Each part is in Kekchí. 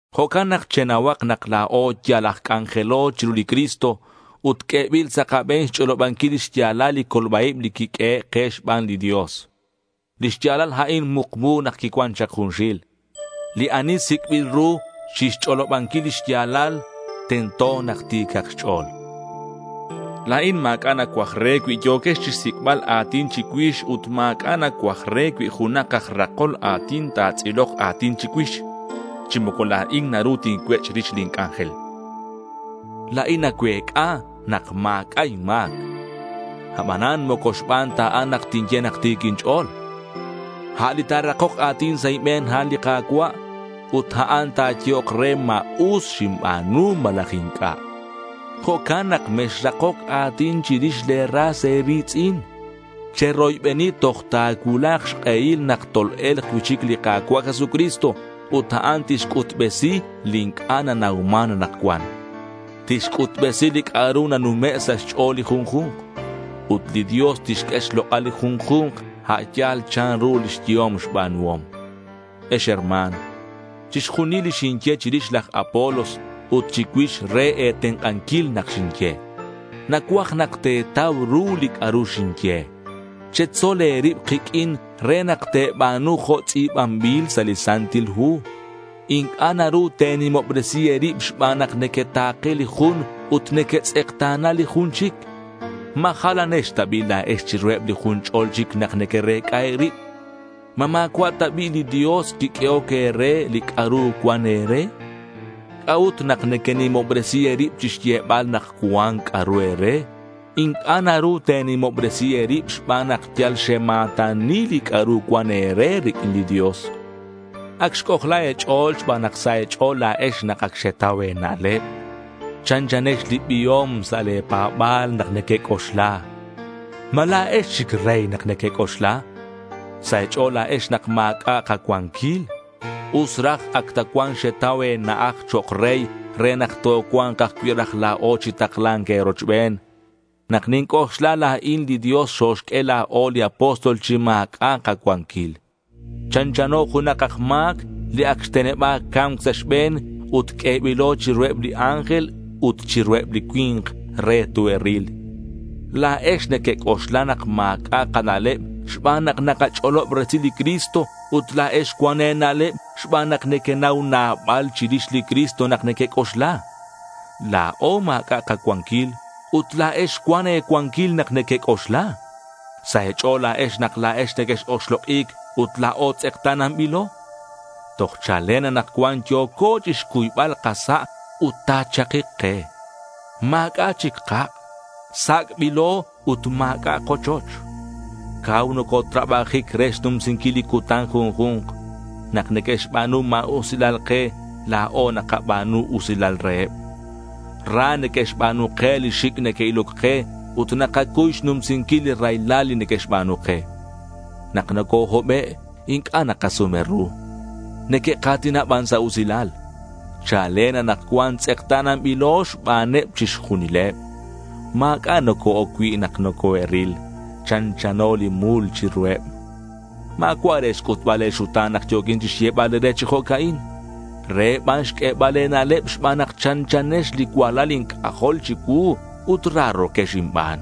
Jo'can nak chenauhak nak la̱o yal aj c'anjelo chiru li Cristo ut q'uebil sa' kabe̱n xch'olobanquil lix ya̱lal li colba-ib li quiq'uehe' ke xban li Dios. Li xya̱lal a'in mukmu nak quicuan chak junxil. Li ani sic'bil ru chixch'olobanquil li xya̱lal tento nak ti̱cak xch'o̱l. La̱in ma̱c'a' nacuaj re cui yo̱quex chixsic'bal a̱tin chicuix ut ma̱c'a' nacuaj re cui junak aj rakol a̱tin ta̱tz'ilok a̱tin chicuix. Chi moco la̱in naru tincuech' rix lin c'anjel. La̱in nacuec'a nak ma̱c'a' inma̱c. Abanan moco xban ta a'an nak tinye nak ti̱c inch'o̱l. A' li ta̱rakok a̱tin sa' inbe̱n a'an li Ka̱cua', ut a'an ta̱yehok re ma us xinba̱nu malaj inc'a'. Jo'can nak mexrakoc a̱tin chirix le̱ ras e̱ri̱tz'in. Cheroybeni toj ta̱cuulak xk'ehil nak tol-e̱lk cui'chic li Ka̱cua' Jesucristo ut a'an tixc'utbesi li inc'a' nanauman anakcuan. Tixc'utbesi li c'a'ru nanume' sa' xch'o̱l li junju̱nk. Ut li Dios tixq'ue xlok'al li junju̱nk a' yal chanru lix yehom xba̱nuhom. Ex herma̱n, chixjunil li xinye chirix laj Apolos ut chicuix re e̱tenk'anquil nak xinye. Nacuaj nak te̱tau ru li c'a'ru xinye. Chetzol e̱rib kiq'uin re nak te̱ba̱nu jo' tz'i̱banbil sa' li Santil Hu. Inc'a' naru te̱nimobresi e̱rib xban nak nequeta̱ke li jun ut nequetz'ekta̱na li jun chic. ¿Ma jalanex ta bi' la̱ex chiruheb li jun ch'o̱l chic nak nequerec'a e̱rib? ¿Ma ma̱cua' ta bi' li Dios quiq'uehoc e̱re li c'a'ru cuan e̱re? ¿C'a'ut nak nequenimobresi e̱rib chixyebal nak cuan c'a'ru e̱re? Inc'a' naru te̱nimobresi e̱rib xban nak yal xema̱tani li c'a'ru cuan e̱re riq'uin li Dios. Ac xc'ojla e̱ch'o̱l xban nak sa' e̱ch'o̱l la̱ex nak ac xetau e̱na'leb. Chanchanex li biom sa' le̱ pa̱ba̱l nak nequec'oxla. ¿Ma la̱ex chic rey nak nequec'oxla? Sa' e̱ch'o̱l la̱ex nak ma̱c'a' kacuanquil. Us raj ac ta cuan xetau e̱na'aj chok' rey, re nak tocua̱nk ajcui' raj la̱o chi takla̱nc e̱rochben. Nak ninc'oxla la̱in li Dios xoxq'ue la̱o li apóstol chi ma̱c'a' kacuanquil. Chanchano junak aj ma̱c li ac xteneba̱c ca̱mc sa' xbe̱n ut q'uebilo chiruheb li ángel ut chiruheb li cui̱nk re toe'ril. La̱ex nequec'oxla nak ma̱c'a' kana'leb xban nak nakach'olob resil li Cristo ut la̱ex cuan e̱na'leb xban nak nequenau nabal chirix li Cristo nak nequec'oxla. La̱o ma̱c'a' kacuanquil ut la̱ex cuan e̱cuanquil nak nequec'oxla. Sa' e̱ch'o̱l la̱ex nak la̱ex nequex-oxlok'i̱c ut la̱o tz'ekta̱nanbilo. Toj chalen anakcuan yo̱co chixcuybal kasa' ut ta̱chakik ke. Ma̱c'a' chic kak'. Sac'bilo ut ma̱c'a' kochoch. Cau nocotrabajic re xnumsinquil li cutan junju̱nk. Nak neque'xba̱nu ma̱usilal ke, la̱o nakaba̱nu usilal reheb. Ra neque'xba̱nu ke li xic' neque'iloc ke ut nakacuy xnumsinquil li raylal li neque'xba̱nu ke. Nak nocohobe' inc'a' nakasume ru. Neque'ka̱tina ban sa' usilal. Chalen anakcuan tz'ekta̱nanbilo xbaneb chixjunileb. Ma̱c'a' noco-oc cui' nak nocoe'ril. Chanchano li mul chiruheb. Ma̱cua' re xc'utbal e̱xuta̱n nak yo̱quin chixyebal e̱re chi jo'ca'in. Re ban xq'uebal e̱na'leb xban nak chanchanex li cualal inc'ajol chicuu ut raro̱quex inban.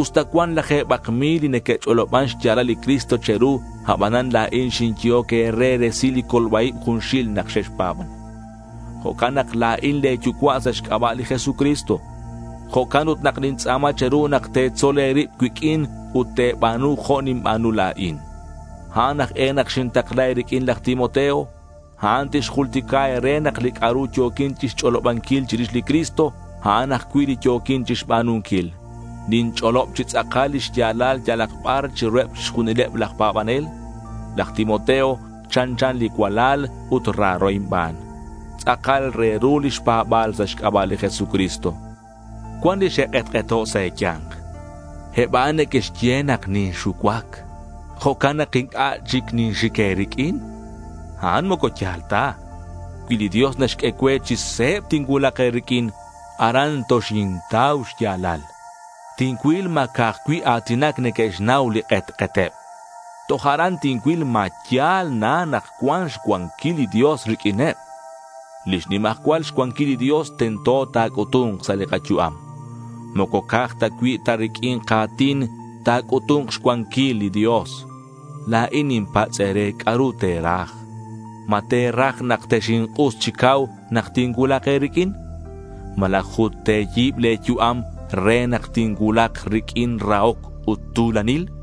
Usta cuan laje̱bak mil li neque'ch'oloban xya̱lal li Cristo che̱ru, abanan la̱in li xinyehoc e̱re resil li colba-ib junxil nak xexpa̱ban. Jo'can nak la̱in le̱ yucua' sa' xc'aba' li Jesucristo. Jo'can ut nak nintz'a̱ma che̱ru nak te̱tzol e̱rib cuiq'uin ut te̱ba̱nu jo' ninba̱nu la̱in. A'an aj e nak xintakla e̱riq'uin laj Timoteo. A'an tixjultica e̱re nak li c'a'ru yo̱quin chixch'olobanquil chirix li Cristo, a'an ajcui' li yo̱quin chixba̱nunquil. Ninch'olob chi tz'akal lix ya̱lal yalak bar chiruheb chixjunileb laj pa̱banel. Laj Timoteo chanchan li cualal ut raro inban. Tz'akal re ru lix pa̱ba̱l sa' xc'aba' li Jesucristo. Cuan li xe'k'etk'eto' sa' e̱ya̱nk. Eb a'an neque'xye nak ninxucuac. Jo'can nak inc'a' chic ninxic e̱riq'uin. A'an moco ya̱l ta. Cui li Dios naxq'ue cue, chi se̱b tincuulak e̱riq'uin. Aran toxintau xya̱lal. Tincuil ma ca'aj cui' a̱tinac neque'xnau li k'etk'eteb. Toj aran tincuil ma ya̱l na nak cuan xcuanquil li Dios riq'uineb. Lix nimajcual cuanquilal li Dios, tento ta̱c'utu̱nk sa' li kayu'am. Moco ca'aj cui' ta riq'uin ka̱tin ta̱c'utu̱nk xcuanquil li Dios. La̱in ninpatz' e̱re c'a'ru te̱raj. ¿Ma te̱raj nak texink'us chi cau nak tincuulak e̱riq'uin? ¿Malaj ut te̱yi̱b le̱ yu'am re nak tincuulak riq'uin rahoc ut tu̱lanil?